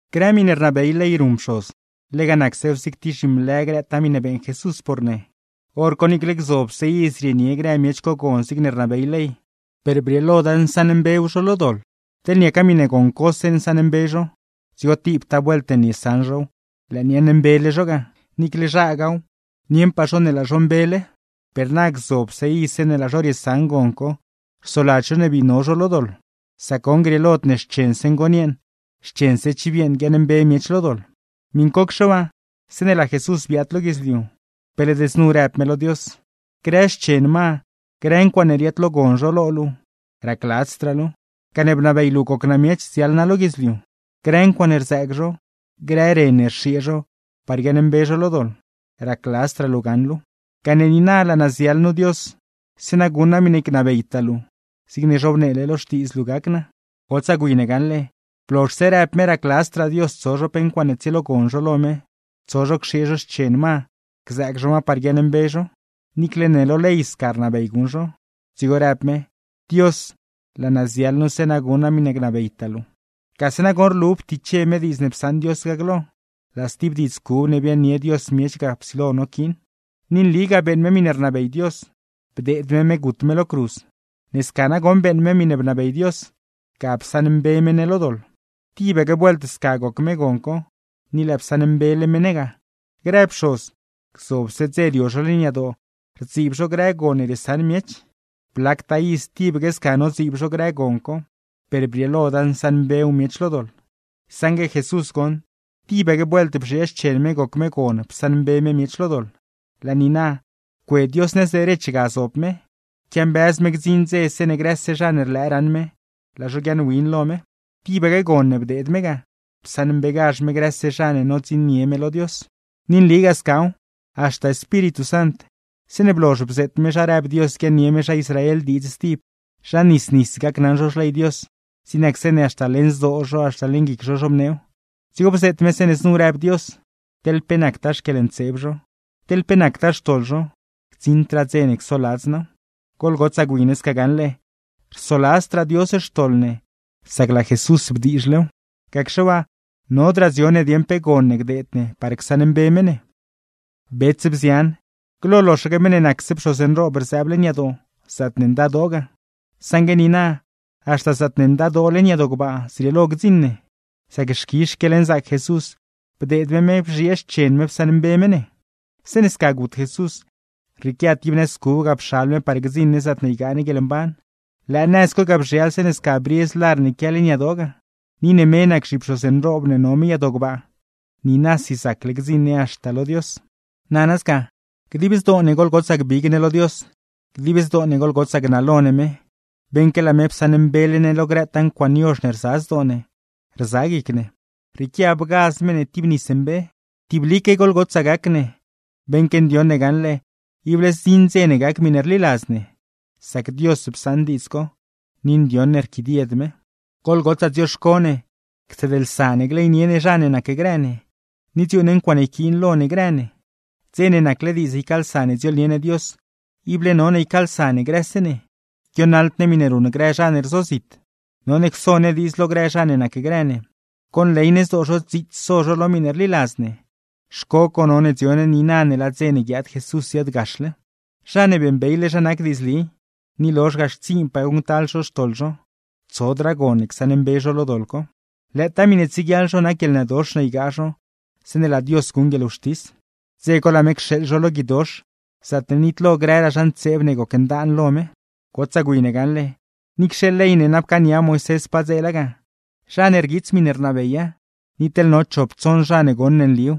Grë miṉe rnabey ley ruṉ pxoz, lega nacsew zig tib zhimlë grëtaa miṉe beeṉ Jesús por ne. Horco niicle gzobse iz rienie grë miech co gon zigne rnabey ley, per brieeloda nsaṉmbew zho lo doḻ. Teḻ niaca miṉe gon cose nsaṉmbe zho, dzigo tibtaa vuelt ne niesaṉ zhow lëë niaaṉmbele zho ga; niicle zhagaaw, nieṉpaa zho ne laa zho mbele. Per na, gzobse iz zeeṉe laa zho riesaṉ gon co rsoladz zho ne bii no zho lo doḻ, sac goṉ, grieelod ne xchense ngon yeeṉ, xchense chiv yeeṉ guiaaṉmbe miech lo doḻ. Miṉcocxe waa, zeeṉe laa Jesús biaad lo guidzliu, pe led znu rëb me lo Dios: Grë xchen ma, grë ncuaaṉe riaadlogon zho lo luu, racladzdraa luuw; gane bnabey luu goc naa miech, ziaḻ naa lo guidzliu. Grë ncuaaṉe rzëëg zho, grë ren ne rxiee zho, par guiaaṉmbe zho lo doḻ; racladzdraa luu gaṉ luuw. Gane niina, laa naa ziaḻ nu Dios, zeeṉa guṉ naa miṉe gnabeytaa luu; zigne zhobneele lo Xtiidz luu gac naa. Gotsaa gwi ne gaṉle, blozhse rëb me racladzdraa Dios tso zho pe ncuaaṉe tsielogon zho lo me, tso zho cxiee zho xchen ma, gzëëg zho ma par guiaaṉmbe zho (niicle ne lo ley sca rnabey guṉ zho); dzigo rëb me: “Dios, laa naa ziaḻ nu zeeṉa guṉ naa miṉe gnabeytaa luu.” Gase nagoṉ rlu ptiche me diidz ne psaṉ Dios ga glo, laa stib diidz cub ne biaaṉnie Dios miech ga psilo noquiin. Ni nligaa beeṉ me miṉe bnabey Dios, bdeed me me gut me lo cruz; ne sca nagoṉ beeṉ me miṉe bnabey Dios, ga psaṉmbe me ne lo doḻ. Tibaque vuelt sca goc me gon co, ni lëë psaṉmbele me ne ga. Grë pxoz, gzobse dze rio zho leṉ yadoo rdziib zho grë gon ne riesaṉ miech; blactaa iz tibaque sca nodziib zho grë gon co, per brieeloda nsaṉmbew miech lo doḻ; saṉgue Jesús goṉ, tibaque vuelt bzhiee xchen me goc me gon psaṉmbe me miech lo doḻ. Laa niina, cue Dios nëz derech ga zob me, quiambëz me gdziṉ dze zeeṉe grëse zha ne rlëë raṉ me, laa zho guiaaṉwin lo me. Tibaque gon ne bdeed me ga, psaṉmbegazh me grëse zha ne nodziṉnie me lo Dios. Ni nligaa scaw, haxta Espíritu Sant, zeeṉe blozh bzeet me zha rëb Dios guiaaṉnie me zha Israel diidz stib, zha nis nis gacnaṉ zho xley Dios, zig nac zeeṉe haxta leṉ zdoo zho, haxta leṉ guic zho zhobneew; dzigo bzeet me zeeṉe znu rëb Dios: “Teḻ pe nactaa xquieḻntseeb zho, teḻ pe nactaa xtoḻ zho, gdziṉdraa dze ne csoladz naaw.” Goḻgotsaa gwi ne sca gaṉle, rsoladzdraa Dios xtoḻ ne sac laa Jesús bdiizhlew; gacxe waa, nodraa dzio ne dieṉ pe gon ne gdeed ne par csaṉmbe me ne. Bets, bzian, glo loxaque meṉ ne nacse pxoz nroob rzëëb leṉ yadoo zaatne Ndadoo ga; saṉgue niina, haxta zaatne Ndadoo leṉ yadoo gbaa zrieelo gdziṉ ne, sac xquizh xquieḻnzaac Jesús, bdeed me me bzhiee xchen me psaṉmbe me ne. Zeeṉe sca gut Jesús, rrieequia tib nëz cub ga pxal me par gdziṉ ne zaatne ygaa ne guieḻmban; lëë nëz co ga bzhial zeeṉe sca briez lar ne quia leṉ yadoo ga. Ni ne me nac zhipxoz nroob ne no me yadoo gbaa, niinasi zacle gdziṉ ne haxta lo Dios. Nana sca, dib zdoo ne goḻgotsaa gbig ne lo Dios, dib zdoo ne goḻgotsaa gnalo ne me, beṉque laa me psaṉmbele ne lo grëtaa ncuaaṉe yozh ne rza zdoo ne, rza guic ne; rrieequia bgaz me ne tib nis mbe. Tiblique sca goḻgotsaa gac ne, beṉque ndioṉ ne gaṉle ible zdziṉ dze ne gac miṉe rliladz ne; sac Dios psaṉ diidz co, ni ndioṉ ne rquidied me. Goḻgotsaa dzioxco ne cseedlsa ne gleynie ne zha ne nacgrë ne, ni dziuuṉ ne ncuaaṉe yquiin lo ne grë ne. Dze ne nacle diidz ycaalsa ne dziooḻnie ne Dios, ible none ycaalsa ne grëse ne, guionaḻd ne miṉe ruṉ grë zha ne rzozit. None cso ne diidz lo grë zha ne nacgrë ne, conley ne zdoo zho dziits so zho lo miṉe rliladz ne; xco co none dzio ne niina ne laa dze ne guiaad Jesús ziaadgaxle. Zha ne beeṉbeyle zha nac diidzli, ni lozh ga xtsiinpaa guṉctal zho xtoḻ zho, tsodraa gon ne csaṉmbe zho lo doḻ co; lëëtaa miṉe tsieguiaḻ zho nac guieḻnëdox ne ygaa zho zeeṉe laa Dios guṉ guieḻwxtis; dze co laa me cxeeḻ zho lo guidox, zaatne nitlo grëraa zha ntseeb ne gocndaan lo me. Gotsaa gwi ne gaṉle, niicxe ley ne na pcaania Moisés padzeela ga, zha ne rguiits miṉe rnabeya, ni teḻ no chop tsoṉ zha ne goṉ ne nliw,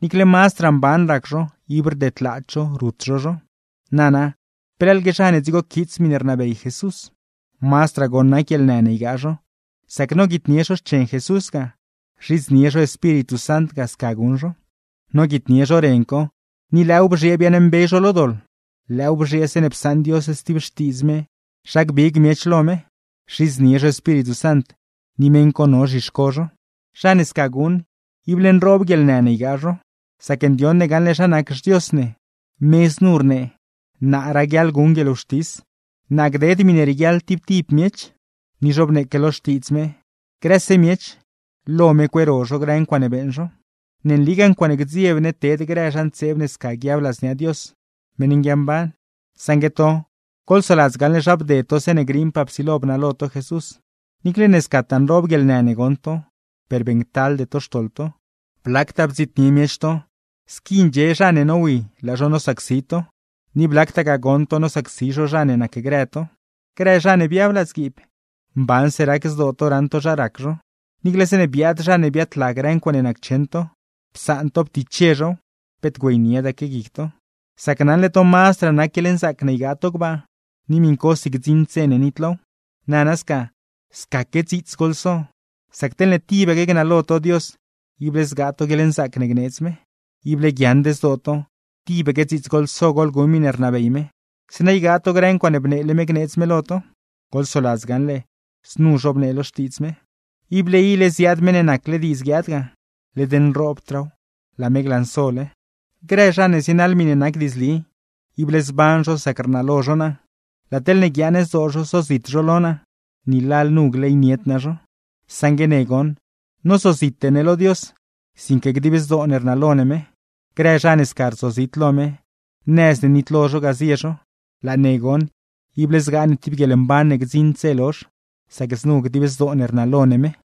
niicle mazdraa mban rac zho ib rdedlaad zho rut zho zho. Nana, ¿pe leḻgue zha ne dzigo quiits miṉe rnabey Jesús? Mazdraa goṉ nac guieḻnë ne ygaa zho, sac noguitnie zho xchen Jesús ga, rzhidznie zho Espíritu Sant ga sca guṉ zho. Noguitnie zho ren co, ni lëëw bzhiee biaaṉmbe zho lo doḻ, lëëw bzhiee zeeṉe psaṉ Dios stib xtiidz me zha gbig miech lo me; rzhidznie zho Espíritu Sant, ni meṉ co no zhixco zho. Zha ne sca guṉ, ible nroob guieḻnë ne ygaa zho; sac ndioṉ ne gaṉle zha nac xDios ne, me znu rnee: “Naa raguiaḻ guṉ guieḻwxtis; naa gded miṉe rieguiaḻ tib tib miech.” Ni zhobneeque lo Xtiidz me: “Grëse miech, lo me cueero zho grë ncuaaṉe beeṉ zho.” ¡Ne nligaa ncuaaṉe gdzieb ne ted grë zha ntseeb ne sca guiab ladznia Dios, meṉ nguiamban! Saṉgue to, goḻsoladz gaṉle zha bded to zeeṉe griiṉpaa psilo bnalo to Jesús, niicle ne scataa nroob guieḻnë ne goṉ to, per beeṉctalde to xtoḻ to. Blactaa bdziitnie miech to, squi ndxie zha ne nowi laa zho nosacsi to; ni blactagaa goṉ to nosacsi zho zha ne nacgrë to. Grë zha ne biab ladzguiib, mbanse rac zdoo to raṉ to zha rac zho; niicle zeeṉe biaad zha ne biaadla grë ncuaaṉe naccheṉ to, psaan to ptiche zhow, peet güeyniedaque guic to; sac naṉle to mazdraa nac guieḻnzaac ne ygaa to gbaa, ni miṉcosi gdziṉd dze ne nitlow. Nana sca, scaque dziits goḻso; sac teḻne tibaque gnalo to Dios, ible zgaa to guieḻnzaac ne gneedz me. Ible guiaaṉd zdoo to, tibaque dziits goḻso goḻguṉ miṉe rnabey me; zeeṉa ygaa to grë ncuaaṉe bneele me gneedz me lo to. Goḻsoladz gaṉle, znu zhobnee lo Xtiidz me: Ible ile ziaad meṉ ne nacle diidz guiaad ga, led nroobdraaw, laa me glansole. Grë zha ne zienaḻ miṉe nac diidzli, ible zban zho sac rnalo zho naa; laa teḻne guiaaṉ zdoo zho sozit zho lo naa, ni lalnu gleynied naa zho. Saṉgue ne goṉ, nozozite ne lo Dios, sinque dib zdoo ne rnalo ne me. Grë zha ne sca rzozit lo me, nëz ne nitlo zho ga zie zho; laa ne goṉ, ible zgaa ne tib guieḻmban ne gdziṉd dze lozh, sacne znu dib zdoo ne rnalo ne me.